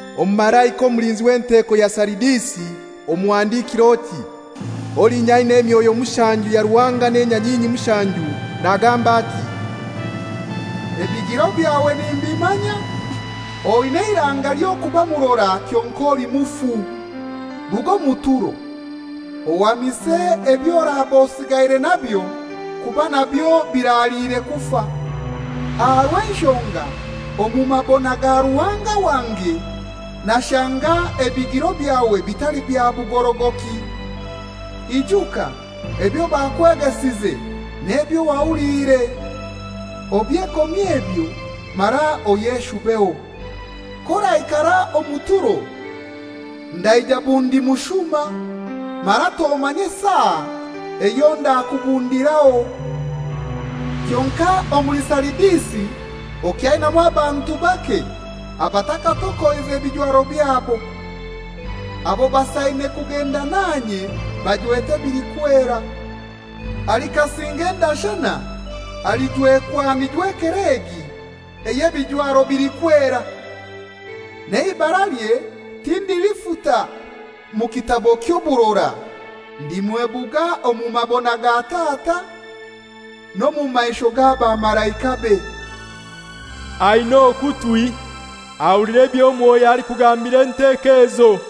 «Omumalaika omulinzi enteko ya Saridisi omuhandikire oti: ‹Olinya aina emyoyo mushanju ya Ruhanga n'enyanyinyi mushanju, nagamba ati: « ‹Ebigiro byawe nimbimanya. Oina eirainga ly'okuba murora kyonkai oli mufu. Ruga omu turo, ohamise eby'oraba osigaire nabyo kuba nabyo biraliire kufa, aha rw'enshonga omu mabona ga Ruhanga wange nashanga ebigiro byawe bitali bya bugorogoki. Ijuka ebyo bakwegesize n'ebyo wahuliire. Obyekomye ebyo mara oyeshubeho. K'oraikara omu turo ndaija bundi mushuma, mara tomanye saa eyo ndakubundiraho. Kyonkai omuli Saridisi okyainamu abantu bake abatakatokoize bijwaro byabo. Abo basaine kugenda nanye bajwete ebilikwera. Alikasinga endashana alijwekwa mijwekerwe egi ey'ebijwaro bilikwera, n'eibaralye tindilifuta mu kitabo ky'oburora. Ndimwebuga omu mabona ga Tata, n'omu maisho g'abamalaikabe. Aina okutwi ahulire ebyo Mwoyo alikugambira enteko ezo.›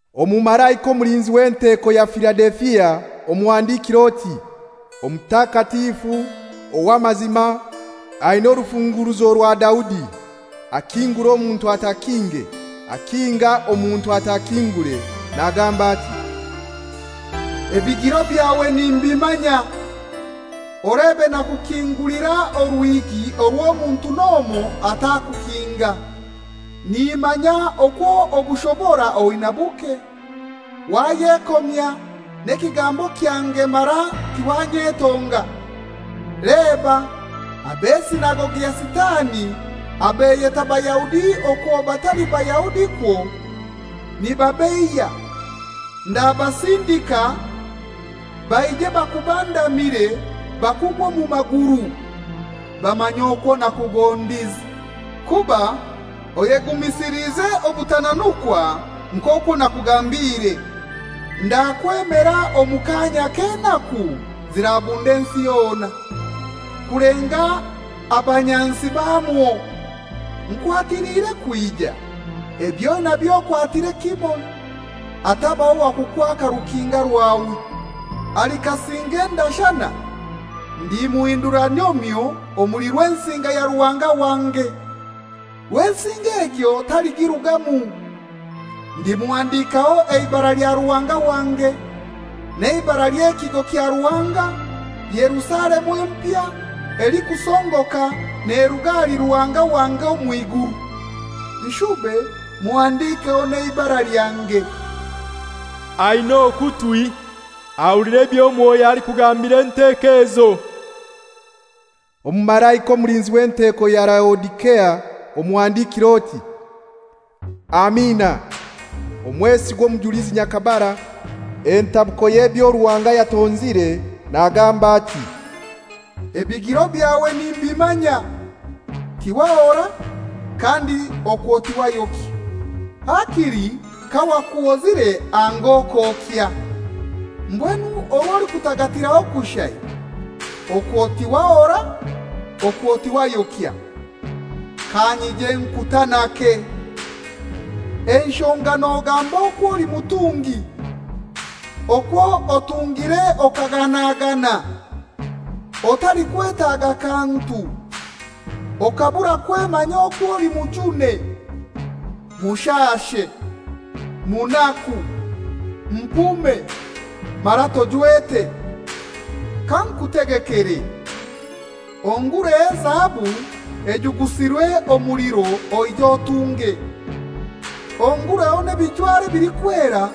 «Omumalaika omulinzi w'enteko ya Filadelifia omuhandikire oti: ‹Omutakatifu, ow'amazima, aina orufunguruzo rwa Daudi, akingura omuntu atakinge, akinga omuntu atakingure, nagamba ati: « ‹Ebigiro byawe nimbimanya. Olebe nakukingulira oruhigi orw'omuntu n'omoi atakukinga. Nimanya okwo obushobora oinai buke, wayekomya n'ekigambo kyange mara tiwanyetonga. Leba ab'esinagogi ya Sitani abeyeta Bayahudi okwo batali Bayahudi kwo, nibabeiya, ndabasindika baije bakubandamire bakugwe omu maguru, bamanye okwo nakugondize. Kuba oyegumisilize obutananukwa nk'okwo nakugambiire. Ndakwemera omu kaanya ak'enaku zirabunda ensi yona, kulenga abanyansi bamwo. Nkwatiliire kwija. Eby'oinabyo okwatire kimoi, hatabaho wa kukwaka rukinga rwawe. Alikasinga endashana ndimuhindura nyomyo omuli Rwensinga ya Ruhanga wange. Rwensinga egyo taligirugamu, ndimuhandikaho eibara lya Ruhanga wange, n'eibara ly'ekigo kya Ruhanga, Yerusalemu empya elikusongoka neruga ahali Ruhanga wange omw'iguru. Nshube muhandikeho n'eibara lyange. Aina okutwi ahulire ebyo Mwoyo alikugambira enteko ezo.› «Omumalaika omulinzi w'enteko ya Laodisea omuhandikire oti: ‹Amina, omwesigwa omujulizi nyakabara, entabuko y'ebyo Ruhanga yatonzire, nagamba ati: « ‹Ebigiro byawe nimbimanya. Tiwahora, kandi okwo towayokya. Hakili kawakuhozire anga okokya! Mbwenu orw'olikutagatiraho kushai, okwo tiwahora, okwo tiwayokya, kanyije nkutanake. Enshonga nogamba okw'oli mutungi, okwo otungire okaganagana, otalikwetaga kantu, okaburwa kwemanya okw'oli mujune, mushashe, munaku, mpume, mara tojwete, kankutegekere: Ongureho ezahabu ejugusirwe omuliro oije otunge, ongureho n'ebijwaro bilikwera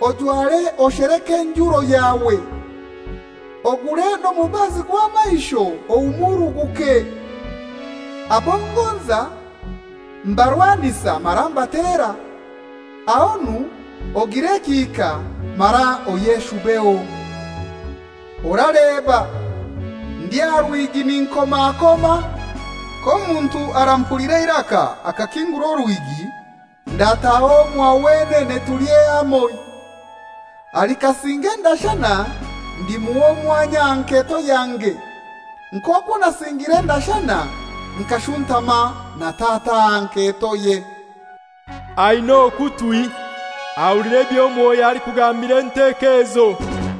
ojware osheleke enjuro yawe, ogure n'omubazi gw'amaisho ohumuruguke. Abo ngonza mbarwanisa mara mbatera. Ahonu ogire ekihika mara oyeshubeho. Oraleba, ndi aha ruhigi ninkomakoma. K'omuntu arampulira eiraka akakingura oruhigi, ndataaha omwa wenene tulye hamoi. Alikasinga endashana ndimuha omwanya aha nketo yange, nk'okwo nasingire endashana nkashuntama na Tata aha nketoye. Aina okutwi ahulire ebyo Mwoyo alikugambira enteko ezo.›»